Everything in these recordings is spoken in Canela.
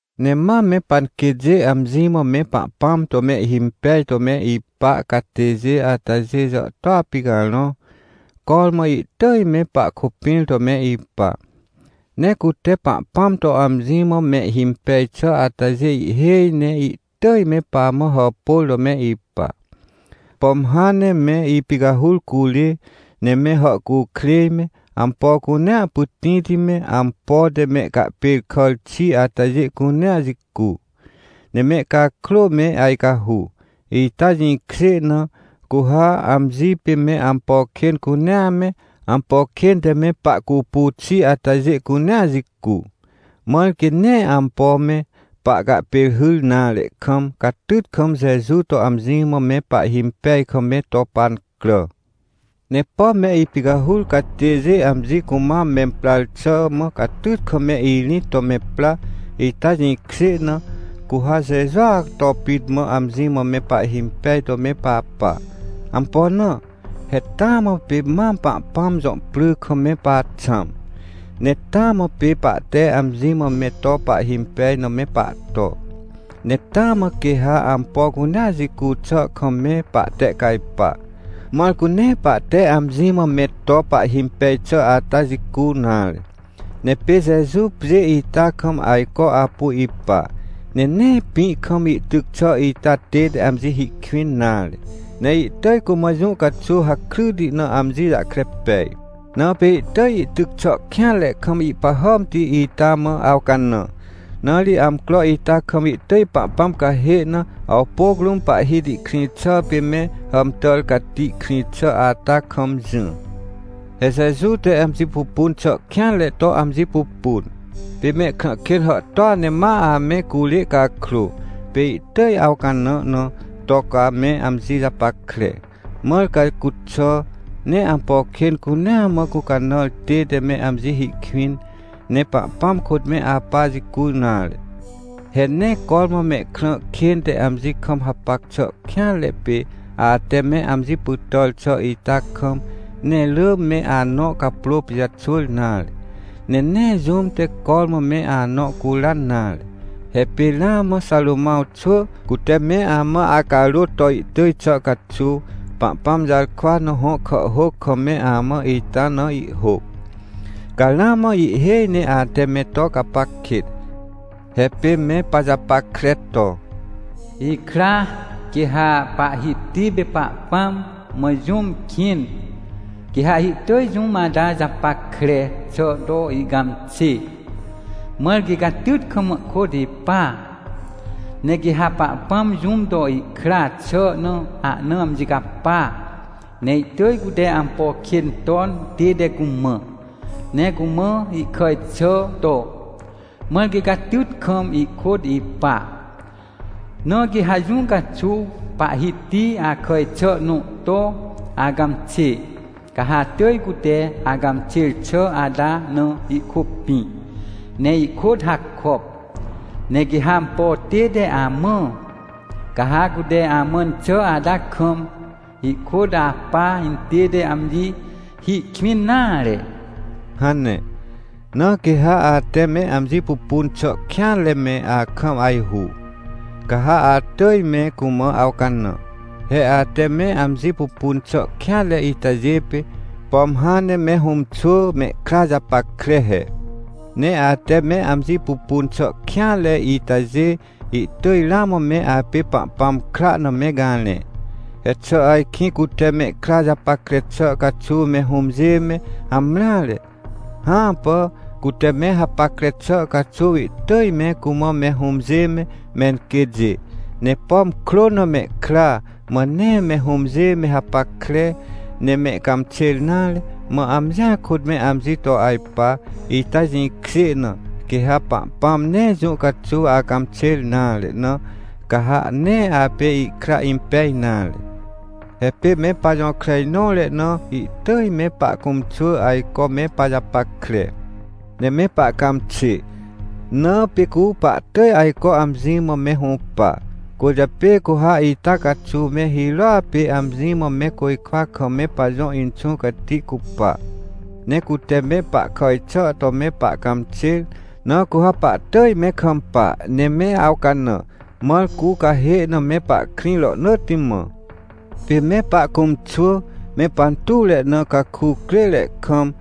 Ne mam me panquêtjê amji mã me Pahpãm to mehhimpej to me ipa catêjê atajê jàhtôa picarõ, cormã ihtỳj me pahkôpĩr to me ipa. Ne cute Pahpãm to amji mã mehhimpej xà atajê ihhêj ne ihtỳj me pamã hàpôr to me ipa. Pom hãn ne me ipicahur curê, ne me hàhcukrêj me, ampo cunea pytĩti me, ampo te mehcahpêrkàr xi atajê cunea jicu, ne mehcakrô me ajcahu, ita jĩkjê na, cu ha amji pê me ampo kên cunea me, ampo kên te me pahcupu xi atajê cunea jicu, mãr quê nee ampo me pahcahpêrhyr nare kam, catyt kam Jeju to amji mã me pahhimpej kam me to pancrà. Ne pom me ipicahur catêjê amji cumam memprar xà mã catyt kam me irĩt to me pra, ita jĩkjê na, cu ha Jejua to pit mã amji mã me pahhimpej to me papa. Ampo na? He taa mã pê mam Pahpãm jõ pry kam me paxãm. Ne taa mã pê pahte amji mã me to pahhimpej na me pahto. Ne taa mã quê ha ampo cunea jicu xà kam me pahtehcajpa, mãr cu nee pahte amji mã me to pahhimpej xà ata jicu nare. Ne pê Jeju pjê ita kam ajco apu ipa, ne nee pĩ kam ihtyc xà ita tête amji hi kwĩn nare. Ne ihtỳj cumã jũ caxuw hakryti na amji jahkre pej, na pê ihtỳj ihtyc xà kêanre kam ihpahàmti ita mã awcanã. Na ri amcro ita kam ihtỳj Pahpãm cahê na, awpôc rũm Pahhiti krĩ xà pê me hàmtàr cati krĩ xà ata kam jỹ. He Jeju te amji pupun xà kêanre to amji pupun, pê mehkrã kên hàhtôa ne ma ame curê cakrô, pê ihtỳj awcanã na, to ca me amji japackre, mãr ca cuxà, nee ampo kên cunea mã gũcanãr tête me amji hi kwĩn, ne Pahpãm kôt me apa jicu nare. He nee cormã mehkrã kên te amji kam hapac xà kêanre pê, ate me amji pytàr xà ita kam, nee rỳ me anõ caprô pijaxwỳr nare. Ne nee jũm te cormã me anõ curan nare. He pê ramã Xarômãw xwỳ, cute me amã acarôt to ihtỳj xà caxuw, Pahpãm jarkwa na hõ kàhhôc kam me amã ita na ihhôc, ca ramã ihhêj ne ate me to gapac kêt! He pê me pajapackre to: “Ikra, quê ha Pahhiti pê Pahpãm mã jũm kĩn, quê ha ihtỳj jũm ata japackre xà to ihcãmxê, mãr quê catyt kam ihkôt ipa. Ne quê ha Pahpãm jũm to ihkra xà na ahna amji capa, ne ihtỳj cute ampo kên ton tête cumã, ne cumã ihkàj xà to, mãr quê catyt kam ihkôt ipa. Na quê ha jũ caxuw Pahhiti akàj xà nõ to acãmxê, ca ha atỳj cute acãmxêr xà ata na ihkôpĩ, ne ihkôt hakop. Ne quê ha ampo tête amã, ca ha cute amãn xà ata kam, ihkôt apa intête amji hi kwĩn nare” hane. Na quê ha ate me amji pupun xà kêanre me akam ajhu, ca ha atỳj me cumã awcanã. He ate me amji pupun xà kêanre itajê pê, pom hãn ne me hũmxwỳ mehkra japackre he. Ne ate me amji pupun xà kêanre itajê, ihtỳj ramã me apê Pahpãm kra na me garẽ. He xà ajkĩ cute mehkra japackre xà caxuw me hũmjê me hamreare? Hãpà. Cute me hapackre xà caxuw ihtỳj me cumã me hũmjê me, menquêtjê. Ne pom krô na mehkra, mã nee me hũmjê me hapackre, ne mehcãmxêr nare, mã amjia kôt me amji to ajpa, ita jĩkjê na, quê ha Pahpãm nee jũ caxuw acãmxêr nare na, ca ha nee apê ihkra impej nare. He pê me pajõkrenõre na ihtỳj me pahcũmxwỳ ajco me pajapackre, ne me pahcãmxê, na pê cu pahtỳj ajco amji mã me hũpa. Cwỳrjapê cu ha ita caxuw me hirôa pê amji mã me côjkwa kam me pajõ Inxũ Cati cupa. Ne cute me pahkàj xà to me pahcãmxêr, na cu ha pahtỳj me kampa, ne me awcanã, mãr cu cahê na me pahkrĩ rohnỳtti mã. Pê me pahcũmxwỳ, me pantuwre na, caku crêre kam,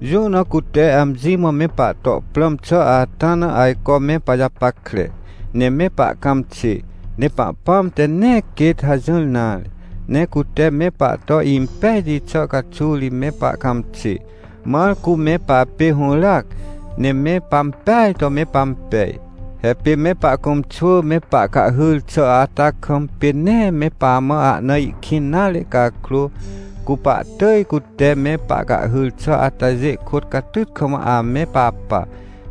jũ na cute amji mã me pahto prãm xà ata na ajco me pajapackre, ne me pahcãmxê. Ne Pahpãm te nee quêt hajỹr nare. Ne cute me pahto impejti xà caxuw ri me pahcãmxê, mãr cu me papê hũràac, ne me pampeaj to me pampej. He pê me pahcũmxwỳ me pahcahhyr xà ata kam, pê nee me pamã ahna ihkĩn nare cakrô, cu pahtỳj cute me pahcahhyr xà atajê kôt catyt kam ame papa,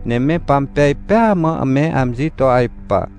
ne me pampej pêa mã me amji to ajpa.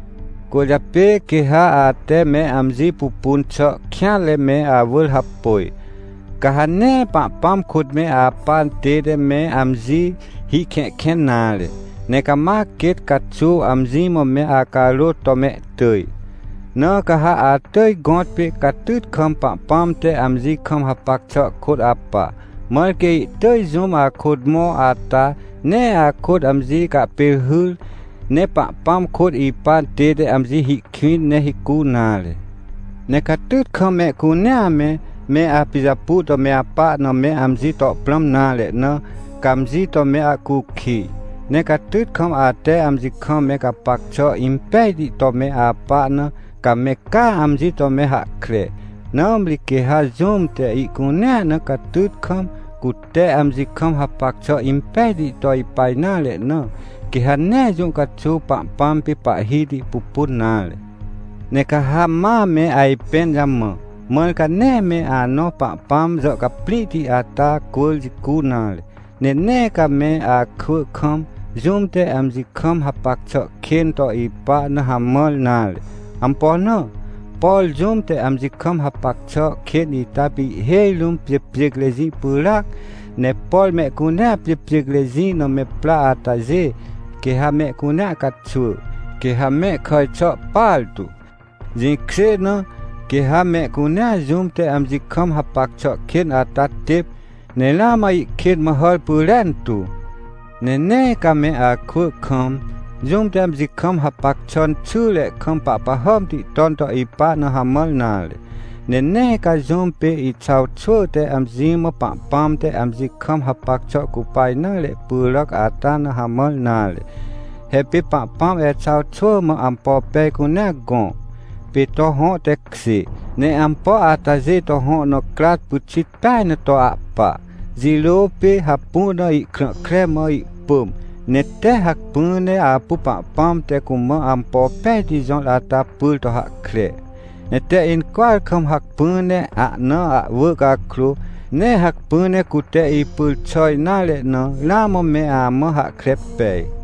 Cwỳrjapê, quê ha ate me amji pupun xà kêanre me awỳr hapôj, ca ha nee Pahpãm kôt me apa tête me amji hihkẽhkẽn nare, ne cama quêt caxuw amji mã me acarôt to mehtỳj. Na ca ha atỳj gõtpê catyt kam Pahpãm te amji kam hapac xà kôt apa, mãr quê ihtỳj jũm akôt mõ ata, nee akôt amji cahpêrhyr, ne Pahpãm kôt ipa tête amji hi kwĩn, ne hicu nare. Ne catyt kam mehcunea me, me apijapu to me apa na me amji to prãm nare na, ca amji to me ahcukij. Ne catyt kam ate amji kam me gapac xà impejti to me apa na, ca me caa amji to me hahkre. Nãmri quê ha jũm te ihcunea na catyt kam, cute amji kam hapac xà impejti to ipa nare na, quê ha nee jũ caxuw Pahpãm pê Pahhiti pupun nare. Ne ca ha ma me ajpẽn jamã, mãr ca nee me anõ Pahpãm jàhcaprĩhti ata cwỳr jicu nare. Ne nee ca me akwỳ kam, jũm te amji kam hapac xà kên to ipa na hamãr nare. Ampo na? Por jũm te amji kam hapac xà kên ita pê ihhêj rũm pjêpjêcrejĩ pyràac. Ne por mehcunea pjêpjêcrejĩ na me pra atajê, quê ha mehcunea caxwỳ, quê ha me kàj xà partu. Jĩkjê na, quê ha mehcunea jũm te amji kam hapac xà kên ata têp, ne ramã ihkên mã hàr pyrentu. Ne nee ca me akwỳ kam, jũm te amji kam hapac xà xyre kam pahpahàmti ton to ipa na hamãr nare. Ne nee ca jũm pê Exaw xwỳ te amji mã Pahpãm te amji kam hapac xà cupa nare pyràc ata na hamãr nare. He pê Pahpãm Exaw xwỳ mã ampo pej cunea gõ, pê to hõ tekjê. Ne ampo atajê to hõ na crat pyxit peaj na to ahpa. Jirô pê hapu na ihkrã kre mã ihpỳm, ne tee hacpỹ ne apu Pahpãm te cumã ampo pejti jõr ata pyr to hahkre, ne tee incwỳar kam hacpỹ ne ahna ahwỳ cakrô, nee hacpỹ ne cute ipyr xà nare na, ramã me amã hahkre pej.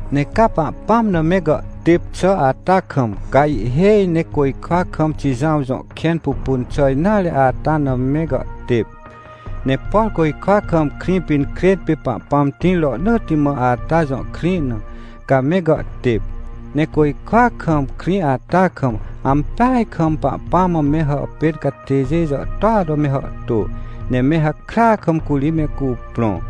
Ne ca Pahpãm na me gàhtêp xà ata kam, ca ihhêj ne côjkwa kam Xijãw jõ kẽn pupun xà nare ata na me gàhtêp. Ne por côjkwa kam Krĩpinkrên pê Pahpãm tĩr rohnỳtti mã ata jõ krĩ na, ca me gàhtêp. Ne côjkwa kam krĩ ata kam, ampeaj kam Pahpãm mã me hàpên catêjê jàhtôa to me hàhtô, ne me hakrya kam curi me cuprõ.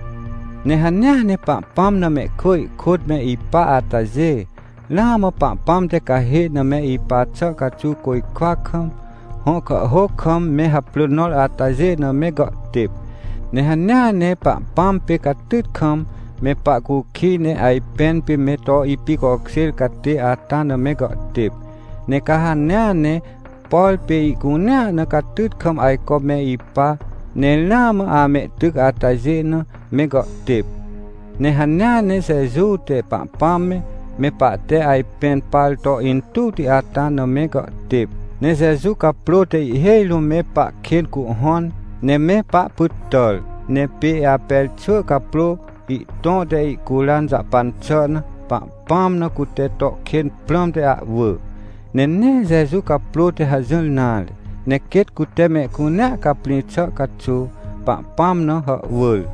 Ne hanea ne Pahpãm na mehkwỳ ihkôt me ipa atajê, ramã Pahpãm te cahê na me ipa xà caxuw côjkwa kam, hõ kàhhôc kam me haprỳ nõr atajê na me gàhtêp. Ne hanea ne Pahpãm pê catyt kam, me pahcukij ne ajpẽn pê me to ipicokjêr catê ata na me gàhtêp. Ne ca hanea ne, por pê ihcunea na catyt kam ajco me ipa, ne ramã amehtyc atajê na, me gàhtêp. Ne hanea ne Jeju te Pahpãm me, me pahte ajpẽn par to intuwti ata na me gàhtêp. Ne Jeju caprô te ihhêj rũm me pahkên cuhhõn, ne me pahpytàr. Ne pê Aper xwỳ caprô, ihtõ te ihcuran jahpan xà na, Pahpãm na cute to kên prãmte ahwỳ. Ne nee Jeju caprô te hajỹr nare. Ne quêt cute mehcunea caprĩ xà caxuw, Pahpãm na hàhwỳr.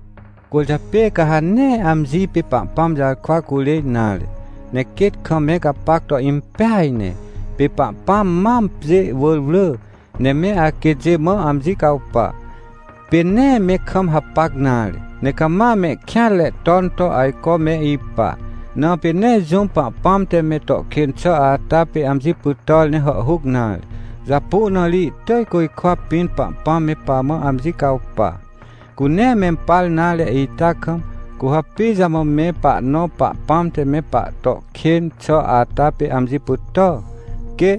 Cwỳrjapê ca ha nee amji pê Pahpãm jarkwa curê nare, ne quêt kam me gapac to impeaj ne. Pê Pahpãm mam pjê wỳr wrỳ, ne me aquêtjê mã amji cawpa. Pê nee me kam hapac nare, ne cama mehkêanre ton to ajco me ipa, na pê nee jũm Pahpãm te me to kên xà ata pê amji pytàr ne hàhhuc nare. Japu na ri ihtỳj côjkwa pĩn Pahpãm me pamã amji cawpa. Cu nee mempar nare ita kam, cu ha pijamã me pahnõ Pahpãm te me pahto kên xà ata pê amji pytà? Quê!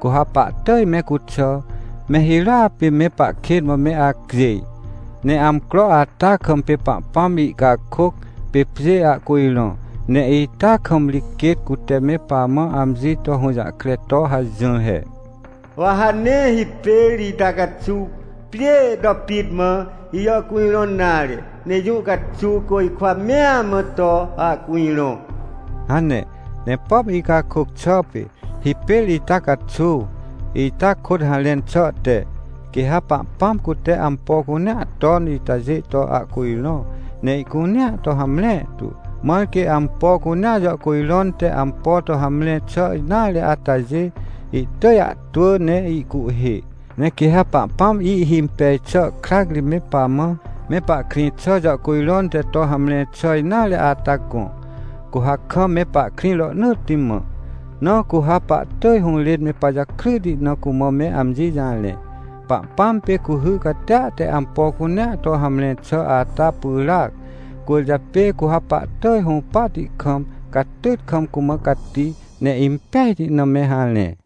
Cu ha pahtỳj me cuxà, me hirôa pê me pahkên mã me acjêj. Ne amcro ata kam pê Pahpãm ihcakôc, pê pjê ahcujrõ. Ne ita kam ri quêt cute me pamã amji to hũjahkre to hajỹr he: — Wa ha nee hipêr ita caxuw pjêê to pit mã ijàhcujrõn nare, ne jũ caxuw côjkwa mea mã to ahcujrõ — hane. Ne pom icakôc xà pê “…hipêr ita caxuw…” ita kôt harẽn xà te, quê ha Pahpãm cute ampo cunea ton itajê to ahcujrõ, ne ihcunea to hamre tu, mãr quê ampo cunea jàhcujrõn te ampo to hamre xà nare atajê, ihtỳj ahtwỳ ne ihcuhhê. Ne quê ha Pahpãm ihhimpej xà krac ri me pamã, me pahkrĩ xà jàhcujrõn te to hamre xà nare ata gõ, cu ha kam me pahkrĩ rohnỳtti mã. Na cu ha pahtỳj hũrên me pajakryti na cumã me amji jarẽ. Pahpãm pê cuhy catia te ampo cunea to hamre xà ata pyràac, cwỳrjapê cu ha pahtỳj hũpahti kam, catyt kam cumã cati, ne impejti na me harẽ.